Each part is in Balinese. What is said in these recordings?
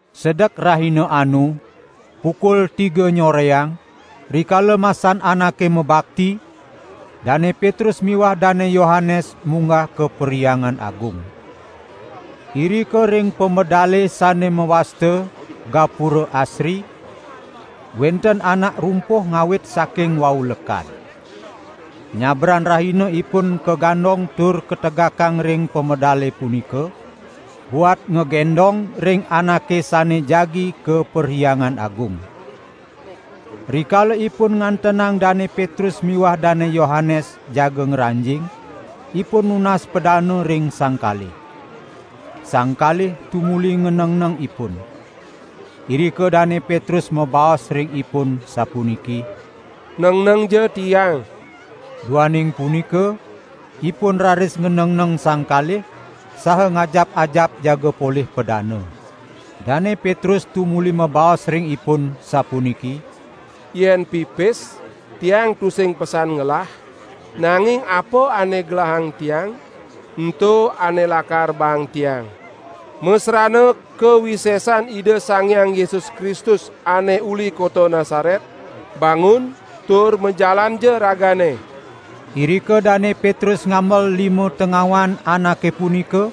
Sedek rahina anu, pukul tiga nyoreang, rikala masan anake mabakti, Dane Petrus miwah Dane Yohanes munggah ka Perhyangan Agung. Irika ring pamedale sane mawasta "Gapura Asri" wenten anak rumpuh ngawit saking wau lekad. Nyabran rahina ipun kagandong tur kategakang ring pamedale punika, buat ngagendong ring anake sane jagi ka Perhyangan Agung. Rikala ipun ngantenang Dane Petrus miwah Dane Yohanes jaga ngranjing, ipun nunas padana ring sang kalih. Sang kalih tumuli nganengneng ipun. Irika Dane Petrus mabaos ring ipun sapuniki: "Nengnengja tiang!" Duaning punika ipun raris nganengneng sang kalih, saha ngajap-ajap jaga polih padana. Dane Petrus tumuli mabaos ring ipun sapuniki: "Yen pipis, tiang tusing pesan ngelah, nanging apa ane gelahang tiang, ento ane lakar baang tiang. Masrana kawisesan Ida Sang Hyang Yesus Kristus ane uli kota Nasaret, bangun tur majalanja ragane!" Irika Dane Petrus ngambel lima tengawan anake punika,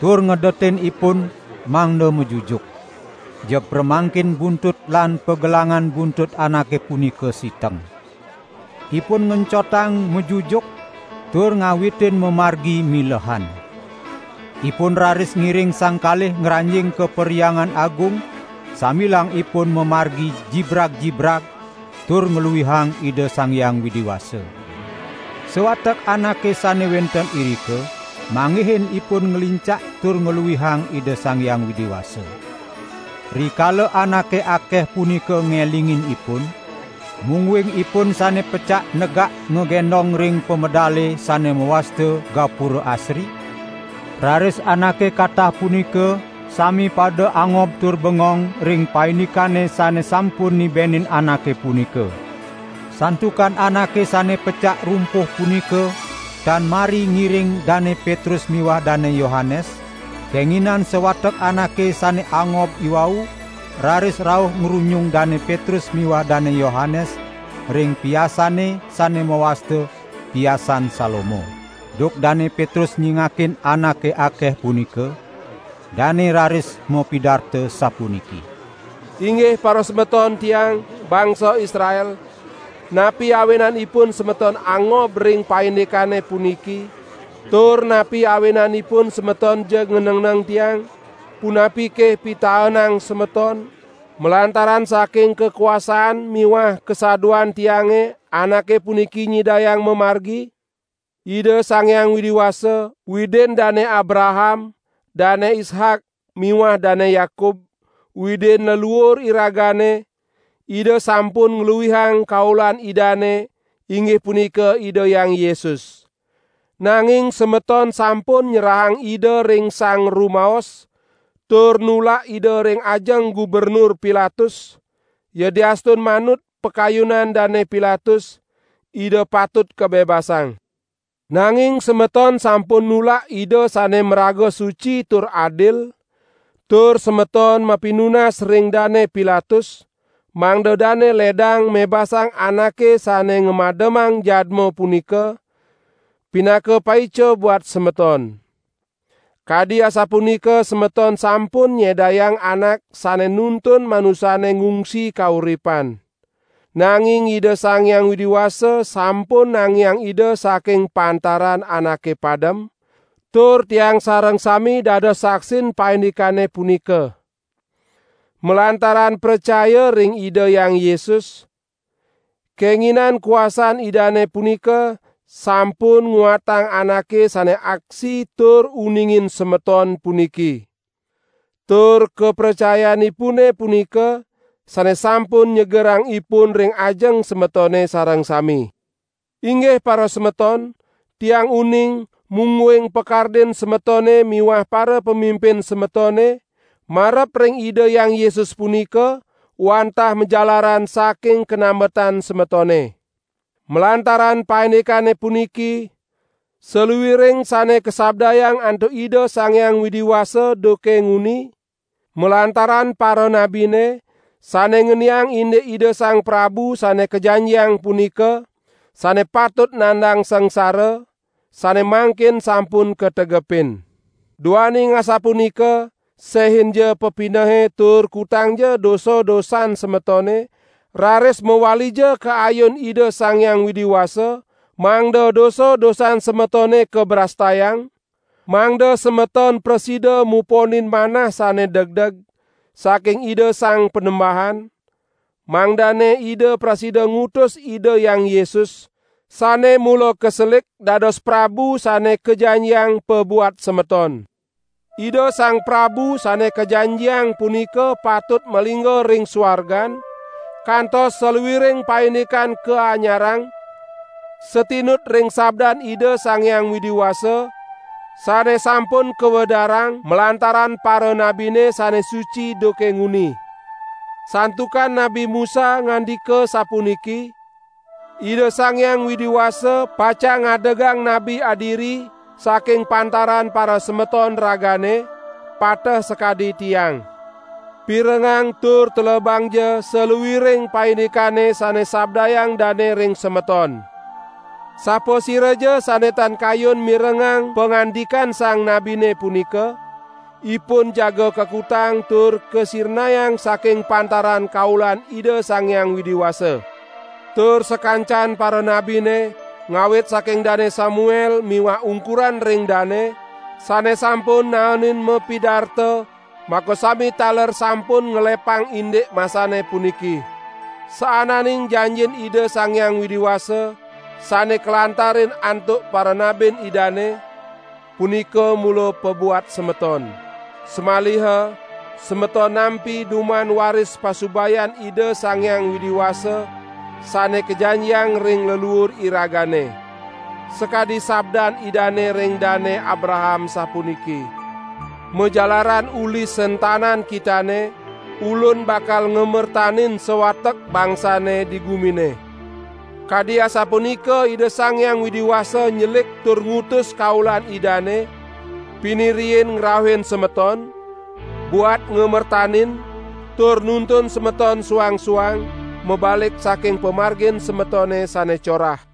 tur ngedetin ipun mangda majujuk. Jeg pramangkin buntut lan pagelangan buntut anake punika siteng. Ipun ngencotang majujuk tur ngawitin mamargi milehan. Ipun raris ngiring sang kalih ngranjing ka Perhyangan Agung sambilang ipun mamargi jibrag-jibrag tur ngluihang Ida Sang Hyang Widi Wasa. Sawatek anake sane wenten irika, manggihin ipun nglincak tur ngluihang Ida Sang Hyang Widi Wasa. Rikala anake akeh punika ngelingin ipun, mungguing ipun sane pecak negak ngagendong ring pamedale sane mawasta "Gapura Asri", raris anake katah punika sami pada angob tur bengong ring paindikane sane sampun nibenin anake punika. Santukan anake sane pecak rumpuh punika tan mari ngiring Dane Petrus miwah Dane Yohanes, kenginan sawatek anake sane angob iwau raris rauh ngrunyung Dane Petrus miwah Dane Yohanes ring piasane sane mawasta, Piasan Salomo. Duk Dane Petrus nyingakin anake akeh punika, dane raris mapidarta sapuniki: "Inggih parasemeton tiang, bangsa Israel, napi awinanipun semeton angob ring paindikane puniki, tur napi awinanipun semeton jeg nganengneng tiang? Punapike pitaenang semeton, malantaran saking kakuasan miwah kasaduan tiange anake puniki nyidayang mamargi? Ida Sang Hyang Widi Wasa, Widin Dane Abraham, Dane Ishak miwah Dane Yakub, Widin leluur iragane, Ida sampun ngluihang kaulan Idane inggih punika Ida Hyang Yesus. Nanging semeton sampun nyerahang Ida ring sang rumaos, tur nulak Ida ring ajeng Gubernur Pilatus, yadiastun manut pakayunan Dane Pilatus, Ida patut kabebasang. Nanging semeton sampun nulak Ida sane maraga suci tur adil, tur semeton mapinunas ring Dane Pilatus mangda dane ledang mebasang anake sane ngamademang jadma punika, pinaka paica buat semeton. Kadi asapunika semeton sampun nyedayang anak sane nuntun manusane ngungsi kauripan. Nanging Ida Sang Hyang Widi Wasa sampun nangiang Ida saking pantaran anake padem, tur tiang sareng sami dados saksin paindikane punika. Malantaran pracaya ring Ida Hyang Yesus, kenginan kuasan Idane punika sampun nguatang anake sane aksi tur uningin semeton puniki. Tur kapracayanipune punika sane sampun nyegerang ipun ring ajeng semetone sareng sami. Inggih parasemeton, tiang uning mungguing pakardin semetone miwah parapamimpin semetone marep ring Ida Hyang Yesus punika, wantah majalaran saking kanambetan semetone. Malantaran paindikane puniki, saluiring sane kasabdayang antuk Ida Sang Hyang Widi Wasa duke nguni malantaran paranabine, sane ngeniang indik Ida Sang Prabu Sane Kajanjiang punika, sane patut nandang sangsara, sane mangkin sampun kategepin. Duaning asapunika sehinja pepinehe tur kutangja dosa-dosan semetone raris mawalija ka ayun Ida Sang Hyang Widi Wasa, mangda dosa-dosan semetone kabrastayang, mangda semeton prasida muponin manah sane degdeg saking Ida Sang Panembahan, mangdane Ida prasida ngutus Ida Hyang Yesus, sane mula kaselik dados Prabu Sane Kajanjiang pabuat semeton. Ida Sang Prabu Sane Kajanjiang punika patut malingga ring suargan, kantos saluiring paindikan kaanyarang, satinut ring sabdan Ida Sang Hyang Widi Wasa, sane sampun kawedarang malantaran paranabine sane suci duke nguni. Santukan Nabi Musa ngandika sapuniki: 'Ida Sang Hyang Widi Wasa, pacang ngadegang Nabi adiri saking pantaran parasemeton ragane, pateh sakadi tiang. Pirengang tur telebangja saluiring paindikane sane sabdayang dane ring semeton. Sapasiraja sane tan kayun mirengang pangandikan sang nabine punika, ipun jaga kakutang tur kasirnayang saking pantaran kaulan Ida Sang Hyang Widi Wasa.' Tur sakancan paranabine, ngawit saking Dane Samuel miwah ungkuran ring dane, sane sampun naenin mapidarta makasami taler sampun ngelepang indik masane puniki. Saananing janjin Ida Sang Hyang Widi Wasa, sane kalantarin antuk paranabin Idane, punika mula pabuat semeton. Samaliha semeton nampi duman waris pasubayan Ida Sang Hyang Widi Wasa sane kajanjiang ring leluur iragane. Sakadi sabdan Idane ring Dane Abraham sapuniki: 'Majalaran uli sentanan kitane, Ulun bakal ngamertanin sawatek bangsane di gumine!' Kadi asapunika Ida Sang Hyang Widi Wasa nyelik tur ngutus kaulan Idane pinih riin ngrauhin semeton, buat ngamertanin tur nuntun semeton suang-suang mabalik saking pamargin semetone sane corah."